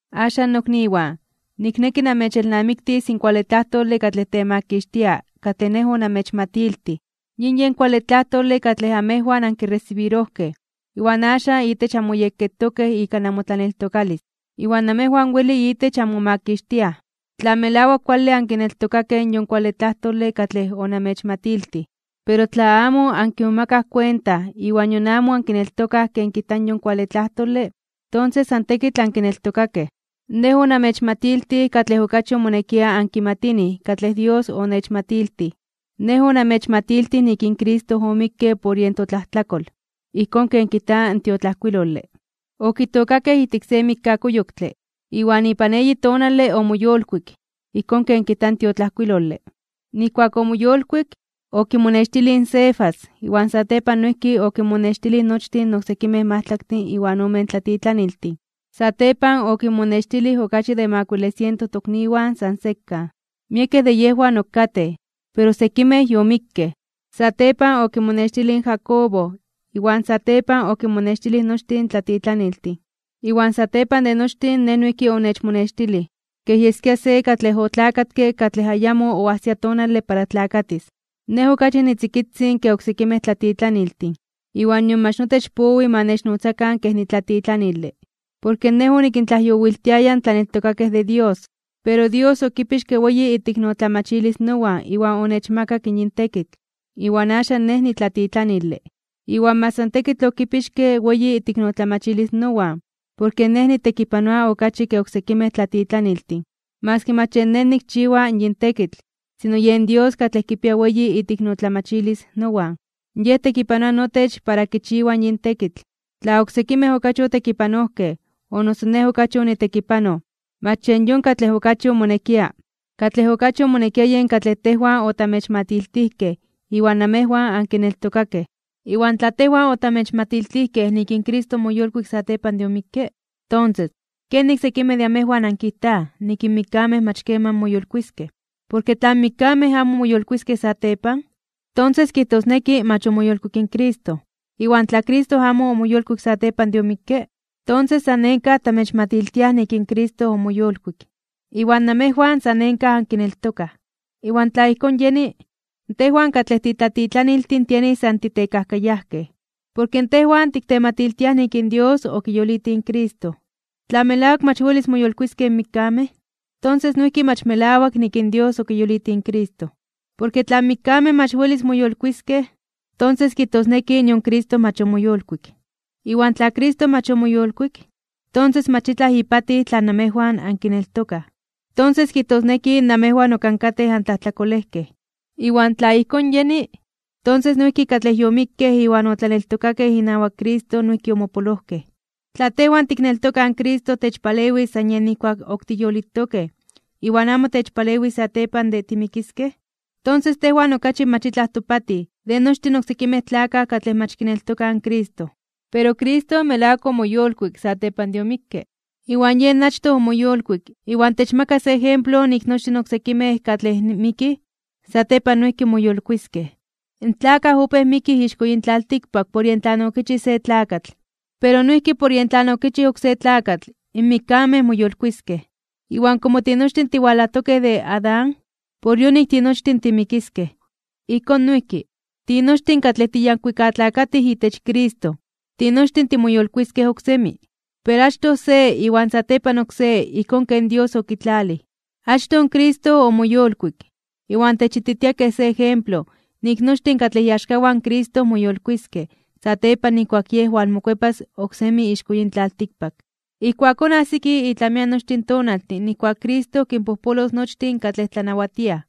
Axan, nokniwan, nikneki namechelnamiktis in kuale tlajtole katlej temakixtia katlej nej onamechmatiltij. Yin yen kuale tlajtole katlej amejwan ankiresibirojkej, iwan axan itech anmoyekketokej ika namotlaneltokalis. Iwan namejwan weli itech anmomakixtiaj, tla melawak kuale ankineltokatokej in yon tlajtole katlej onamechmatiltij. Pero tla amo ankimomakaj kuenta iwan nion amo ankineltokaj ken kijta in yon kuale tlajtole, tonses san tekitl ankineltokakej. Nej onamechmatiltij katlej okachi omonekia ankimatinij katlej Dios onechmatiltij. Nej onamechmatiltij nik in Cristo omikke por yen totlajtlakol, ijkón ken kijta in tiotlajkuilole. Okitookakej ijtik se mikkakuyoktle, iwan ipan eyi tonale omoyolkuik, ijkón ken kijta in tiotlajkuilole. Nijkuak omoyolkuik, okimonextilij in Cefas, iwan satepan noijki okinmonextilij nochtin in oksekimej majtlaktin iwan omen tlatitlaniltin. Satepan okinmonextilij okachi de makuile siento tokniwan san sekan. Miekej de yejwan ok katej, pero sekimej yomikkej. Satepan okimonextilij in Jacobo, iwan satepan okinmonextilij nochtin in tlatitlaniltin. Iwan satepan de nochtin nej noijki onechmonextilij, kej yeskia se katlej otlakatke katlej ayamo oajsia tonale para tlakatis. Nej okachi nitzikitzin ke oksekimej tlatitlaniltin, iwan nion mach notech powi ma nechnotzakan kej nitlatitlanile, porke nej onikintlajyowiltiaya in tlaneltokakej de Dios. Pero Dios okipixke weyi iteiknotlamachilis nowan iwan onechmakak in yin tekitl, iwan axan nej nitlatitlanile. Iwan mach san tekitl okipixke weyi iteiknotlamachilis nowan, porke nej nitekipanoa okachi ke oksekimej tlatitlaniltin. Maski mach yen nej nikchiwa yin tekitl, sino yen Dios katlej kipia weyi iteiknotlamachilis nowan, Yej tekipanoa notech para kichiwa yin tekitl. Tla oksekimej okachi otekipanojkej, o noso nej okachi onitekipanoj, mach yen yon katlej okachi omonekia. Katlej okachi omonekia yen katlej tejwan otamechmatiltijkej iwan namejwan ankineltokakej. Iwan tla tejwan otamechmatiltijkej nik in Cristo omoyolkuik (omoyolitij) satepan de omikke, tonses, ¿kenik sekimej de amejwan ankijtaj nik in mikkamej mach keman moyolkuiskej? Porke tla in mikkamej amo welis moyolkuiskej satepan, tonses kijtosneki mach omoyolkuik in Cristo. Iwan tla Cristo amo omoyolkuik satepan de omikke, tonses san nenkaj (san tekitl) tamechmatiltiaj nik in Cristo omoyolkuik, iwan namejwan san nenkaj ankineltokaj. Iwan tla ijkón yeni, tejwan katlej titlatitlaniltin tienij san titekajkayajkej, porke tejwan tiktematiltiaj nik in Dios okiyolitij in Cristo. Tla melawak mach welis moyolkuiskej in mikkamej, tonses noijki mach melawak nik in Dios okiyolitij in Cristo. Porke tla in mikkamej mach welis moyolkuiskej (moyolitiskej), tonses kijtosneki nion Cristo mach omoyolkuik. Iwan tla Cristo mach omoyolkuik, tonses mach itlaj ipatij tlan namejwan ankineltokaj. Tonses kijtosneki namejwan ok ankatej antlajtlakolejkej. Iwan tla ijkón yeni, tonses noijki katlej yomikkej iwan otlaneltokakej inawak Cristo noijki omopolojkej. Tla tejwan tikneltokaj in Cristo techpalewis san yej nijkuak ok tiyolitokej iwan amo techpalewis satepan de timikiskej, tonses tejwan okachi mach itlaj topatij de nochtin oksekimej tlakaj katlej mach kineltokaj in Cristo. Pero Cristo melawak omoyolkuik (omoyolitij) satepan de omikke. Iwan yen achtoj omoyolkuik, iwan techmaka se ejemplo nik nochtin in oksekimej katlej mikij, satepan noijki moyolkuiskej. In tlakaj opéj mikij ixko yin tlaltikpak por yen tlan okichij se tlakatl, pero noijki por yen tlan okichij in oksé tlakatl, in mikkamej moyolkuiskej. Iwan komo tinochtin tiwalajtokej de Adán, por yonik tinochtin timikiskej. Ijkón noijki, tinochtin katlej tiyankuikatlakatij itech Cristo, tinochtin timoyolkuiskej oksemi. Pero achtoj se iwan satepan oksé ijkón ken Dios yokitlalij. Achtoj Cristo omoyolkuik, iwan techititia kej se ejemplo nik nochtin katlej iaxkawan in Cristo moyolkuiskej (moyolitiskej) satepan nijkuak Yej walmokuepas oksemi ixko yin tlaltikpak. Ijkuakón ajsiki itlamian nochtin tonaltin nijkuak in Cristo kinpojpolos nochtin katlej tlanawatiaj,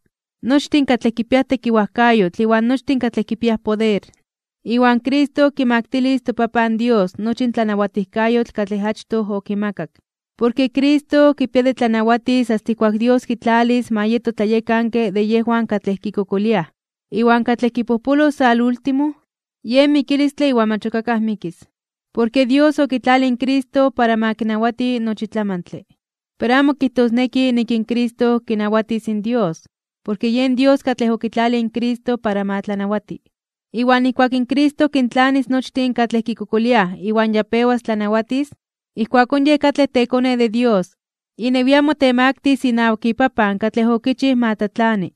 nochtin katlej kipiaj tekiwajkayotl iwan nochtin katlej kipiaj poder. Iwan Cristo kimaktilis in toPapan Dios nochi in tlanawatijkayotl katlej achtoj okimakak. Porke Cristo kipia de tlanawatis asta ijkuak Dios kitlalis ma yeto tlayekanke de yejwan katlej kikokoliaj. Iwan katlej kipojpolos salúltimo, yen mikilistle iwan mach ok akaj mikis. Porke Dios okitlalij in Cristo para ma kinawati nochi tlamantle. Pero amo kijtosneki nik in Cristo kinawatis in Dios, porke yen Dios katlej okitlalij in Cristo para ma tlanawati. Iwan nijkuak in Cristo kintlanis nochtin katlej kikokoliaj iwan ya pewas kinnawatis, ijkuakón Yej katlej teKone de Dios, inewian motemaktis (motemaktilis) inawak iPapan katlej okichij ma tlatlani.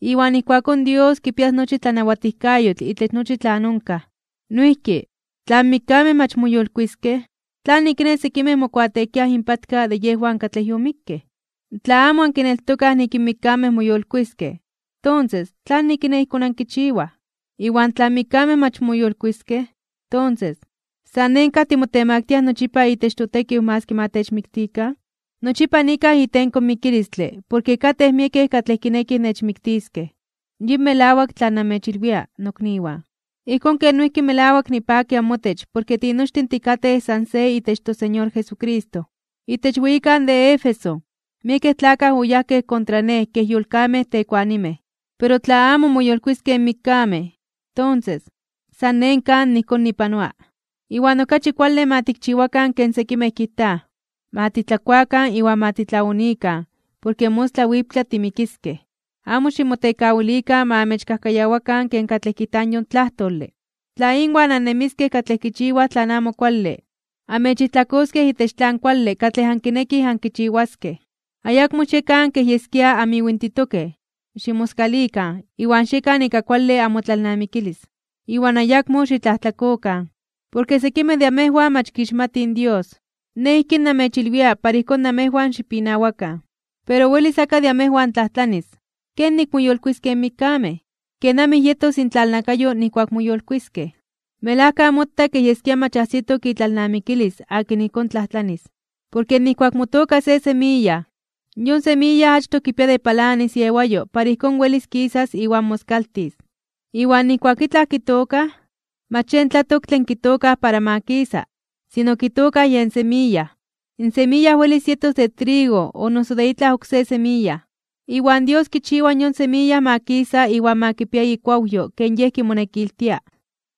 Iwan ijkuakón Dios kipias nochi tlanawatijkayotl itech nochi tlan onkaj. Noijki, tla in mikkamej mach moyolkuiskej (moyolitiskej), ¿tlanik kiné sekimej mokuateekiaj inpatka de yejwan katlej yomikkej? Tla amo ankineltokaj nik in mikkamej moyolkuiskej, tonses, ¿tlanik kiné ijkón ankichiwaj? Iwan tla in mikkamej mach moyolkuiskej (moyolitiskej), tonses, ¿san nenkaj (san tekitl) timotemaktiaj nochipa itech totekiw maski ma techmiktikan? Nochipa nikaj itenko mikilistle porke katej miekej katlej kinekij nechmiktiskej. Yin melawak tlan namechilwia, nokniwan, ijkón ken noijki melawak nipaki amotech porke tinochtin tikatej san se itech toSeñor Jesucristo. Itech weyikan de Éfeso miekej tlakaj oyajkej kontra nej kej yolkamej tekuanimej. Pero tla amo moyolkuiskej in mikkamej, tonses, san nenkaj (san tekitl) ijkón nipanoa. Iwan okachi kuale ma tikchiwakan ken sekimej kijtaj: “Ma titlakuakan iwan ma titlaonikan, porke mostla wiptla timikiskej.” Amo ximotekawilikan ma amechkajkayawakan ken katlej kijta yon tlajtole. Tla inwan annemiskej katlej kichiwaj tlan amo kuale, amechijtlakoskej itech tlan kuale katlej ankinekij ankichiwaskej. Ayakmo xiekan kej yeskia amiwintitokej, ximoskalikan (xitlalnamikikan) iwan xiekan ika kuale amotlalnamikilis, iwan ayakmo xitlajtlakokan. Porke sekimej de amejwan mach kixmatij Dios. Nej ijkín namechilwia para ijkón namejwan xipinawakan. Pero welis akaj de amejwan tlajtlanis: “¿Kenik moyolkuiskej in mikkamej? ¿Kenamij yetos intlalnakayo nijkuak moyolkuiskej?” Melajka mota kej yeskia mach ajsitok itlalnamikilis akin ijkón tlajtlanis. Porke nijkuak motooka se semiya, yon semiya achtoj kipia de palanis iewayo para ijkón welis kisas iwan moskaltis. Iwan nijkuak itlaj tiktookaj, mach yen tlatoktle in tiktookaj para ma kisa, sino tiktookaj yen semiya. In semiya welis yetos de trigo o noso de itlaj oksé semiya. Iwan Dios kichiwa yon semiya ma kisa iwan ma kipia ikuawyo ken Yej kimonekiltia.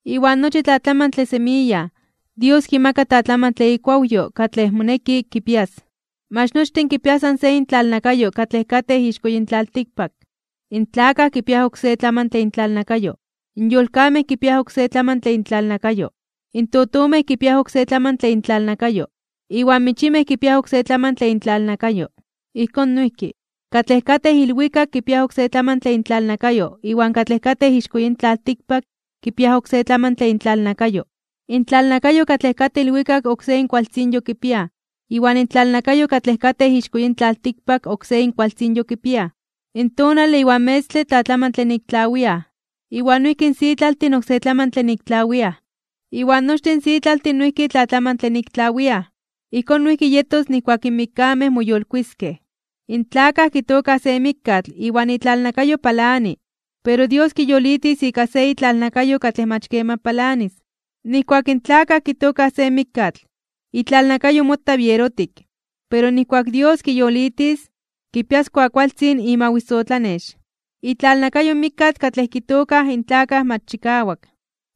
Iwan nochi tlatlamantle semiya Dios kimaka tlatlamantle ikuawyo katlej moneki kipias. Mach nochtin kipiaj san se intlalnakayo katlej katej ixko yin tlaltikpak. In tlakaj kipiaj oksé tlamantle intlalnakayo, in yolkamej kipiaj oksé tlamantle intlalnakayo, in totomej kipiaj oksé tlamantle intlalnakayo, iwan michimej kipiaj oksé tlamantle intlalnakayo. Ijkón noijki, katlej katej ilwikak kipiaj oksé tlamantle intlalnakayo iwan katlej katej ixko yin tlaltikpak kipiaj oksé tlamantle intlalnakayo. Intlalnakayo katlej katej ilwikak oksé inkualtzinyo kipiaj iwan intlalnakayo katlej katej ixko yin tlaltikpak oksé inkualtzinyo kipiaj. In tonale iwan metztle tlatlamantle nik tlawiaj, iwan noijki in sitlaltin oksé tlamantle nik tlawiaj. Iwan nochtin sitlaltin noijki tlatlamantle nik tlawiaj. Ijkón noijki yetos nijkuak in mikkamej moyolkuiskej (moyolitiskej). In tlakaj kitookaj se mikkatl iwan itlalnakayo palani, pero Dios kiyolitis ika se itlalnakayo katlej mach keman palanis. Nijkuak in tlakaj kitookaj se mikkatl, itlalnakayo mota bierotik, pero nijkuak in Dios kiyolitis, kipias kuakualtzin imawisotlanex. Itlalnakayo in mikkatl katlej kitookaj in tlakaj mach chikawak,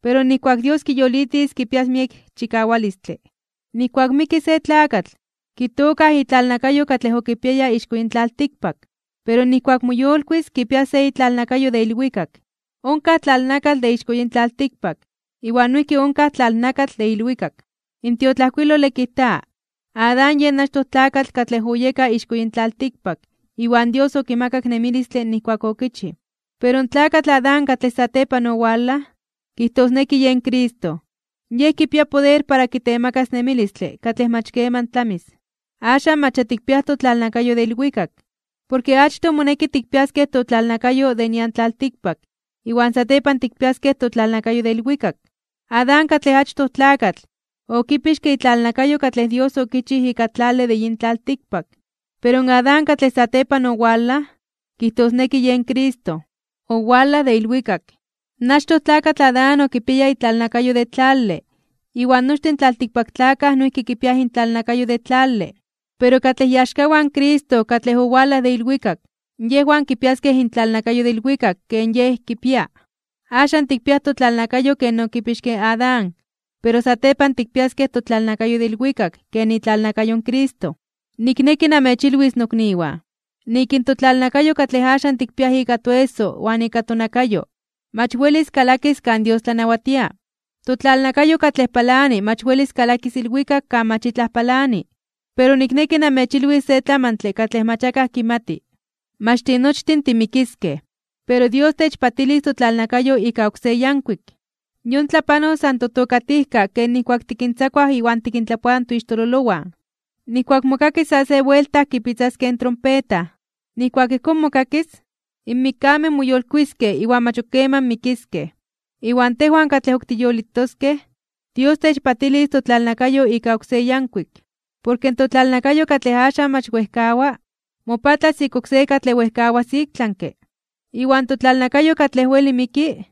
pero nijkuak in Dios kiyolitis kipias miek chikawalistle. Nijkuak miki se tlakatl, kitookaj itlalnakayo katlej okipiaya ixko yin tlaltikpak, pero nijkuak moyolkuis (moyolitis) kipias se itlalnakayo de ilwikak. Onkaj tlalnakatl de ixko yin tlaltikpak, iwan noijki onkaj tlalnakatl de ilwikak. In tiotlajkuilole kijta: “Adán yen achtoj tlakatl katlej oyeka ixko yin tlaltikpak, iwan Dios okimakak nemilistle nijkuak okichij.” Pero in tlakatl Adán katlej satepan owalaj, kijtosneki yen Cristo, Yej kipia poder para kitemakas nemilistle katlej mach keman tlamis. Axan mach ya tikpiaj totlalnakayo de ilwikak. Porke achtoj moneki tikpiaskej totlalnakayo de nian tlaltikpak iwan satepan tikpiaskej totlalnakayo de ilwikak. Adán, katlej achtoj tlakatl, okipixke itlalnakayo katlej Dios okichij ika tlale de yin tlaltikpak. Pero in Adán katlej satepan owalaj, kijtosneki yen Cristo, owalaj de ilwikak. In achtoj tlakatl Adán okipiaya itlalnakayo de tlale, iwan nochtin in tlaltikpaktlakaj noijki kipiaj intlalnakayo de tlale. Pero katlej iaxkawan in Cristo katlej owalaj de ilwikak, yejwan kipiaskej intlalnakayo de ilwikak ken Yej kipia. Axan tikpiaj totlalnakayo ken okipixke in Adán, pero satepan tikpiaskej totlalnakayo de ilwikak ken itlalnakayo in Cristo. Nikneki namechilwis nokniwan, nik in totlalnakayo katlej axan tikpiaj ika toeso iwan ika tonakayo, mach welis kalakis kan Dios tlanawatia. Totlalnakayo katlej palani mach welis kalakis ilwikak kan mach itlaj palani. Pero nikneki namechilwis se tlamantle katlej mach akaj kimati. Mach tinochtin timikiskej, pero Dios techpatilis totlalnakayo ika oksé yankuik. Yon tlapanos san totokatijkak ken nijkuak tikintzakuaj iwan tikintlapoaj toixtololowan, nijkuak mokakis sa se buelta kipitzaskej in trompeta. Nijkuak ijkón mokakis, in mikkamej moyolkuiskej (moyolitiskej) iwan mach ok keman mikiskej, iwan tejwan katlej ok tiyolitoskej, Dios techpatilis totlalnakayo ika oksé yankuik. Porke in totlalnakayo katlej axan mach wejkawa, mopatlas ika oksé katlej wejkawas iktlanke (ik tlami). Iwan totlalnakayo katlej weli miki,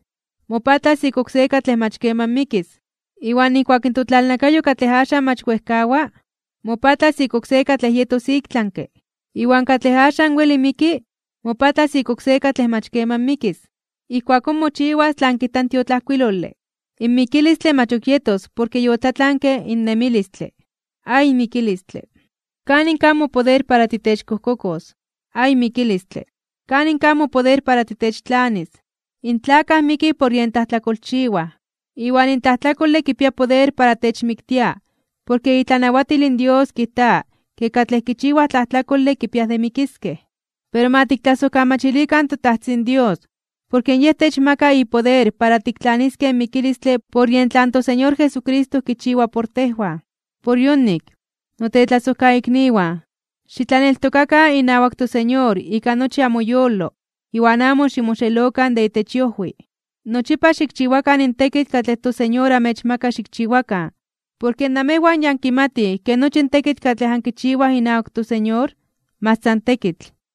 mopatlas ika oksé katlej mach keman mikis. Iwan nijkuak in totlalnakayo katlej axan mach wejkawa, mopatlas ika oksé katlej yetos iktlanke (ik tlami), iwan katlej axan weli miki mopatlas ika oksé katlej mach keman mikis, ijkuakón mochiwas tlan kijta in tiotlajkuilole: “In mikilistle mach ok yetos porke yotlatlanke in nemilistle. ¡Ay mikilistle! ¿Kanin kaj mopoder para titechkojkokos? ¡Ay mikilistle! ¿Kanin kaj mopoder para titechtlanis?” In tlakaj mikij por yen tlajtlakolchiwaj, iwan in tlajtlakole kipia poder para techmiktia porke itlanawatil in Dios kijta ke katlej kichiwaj tlajtlakole kipiaj de mikiskej. Pero ma tiktlasojkamachilikan in toTajtzin Dios porke Yej techmaka ipoder para tiktlaniskej in mikilistle por yen tlan toSeñor Jesucristo kichiwa por tejwan. Por yonik, notetlasojkaikniwan, xitlaneltokatokan inawak toSeñor ika nochi amoyolo iwan amo ximoxelokan de itech iojwi. Nochipa xikchiwakan in tekitl katlej toSeñor amechmaka xikchiwakan. Porke namejwan ya ankimatij ke nochi in tekitl katlej ankichiwaj inawak toSeñor, mach san tekitl.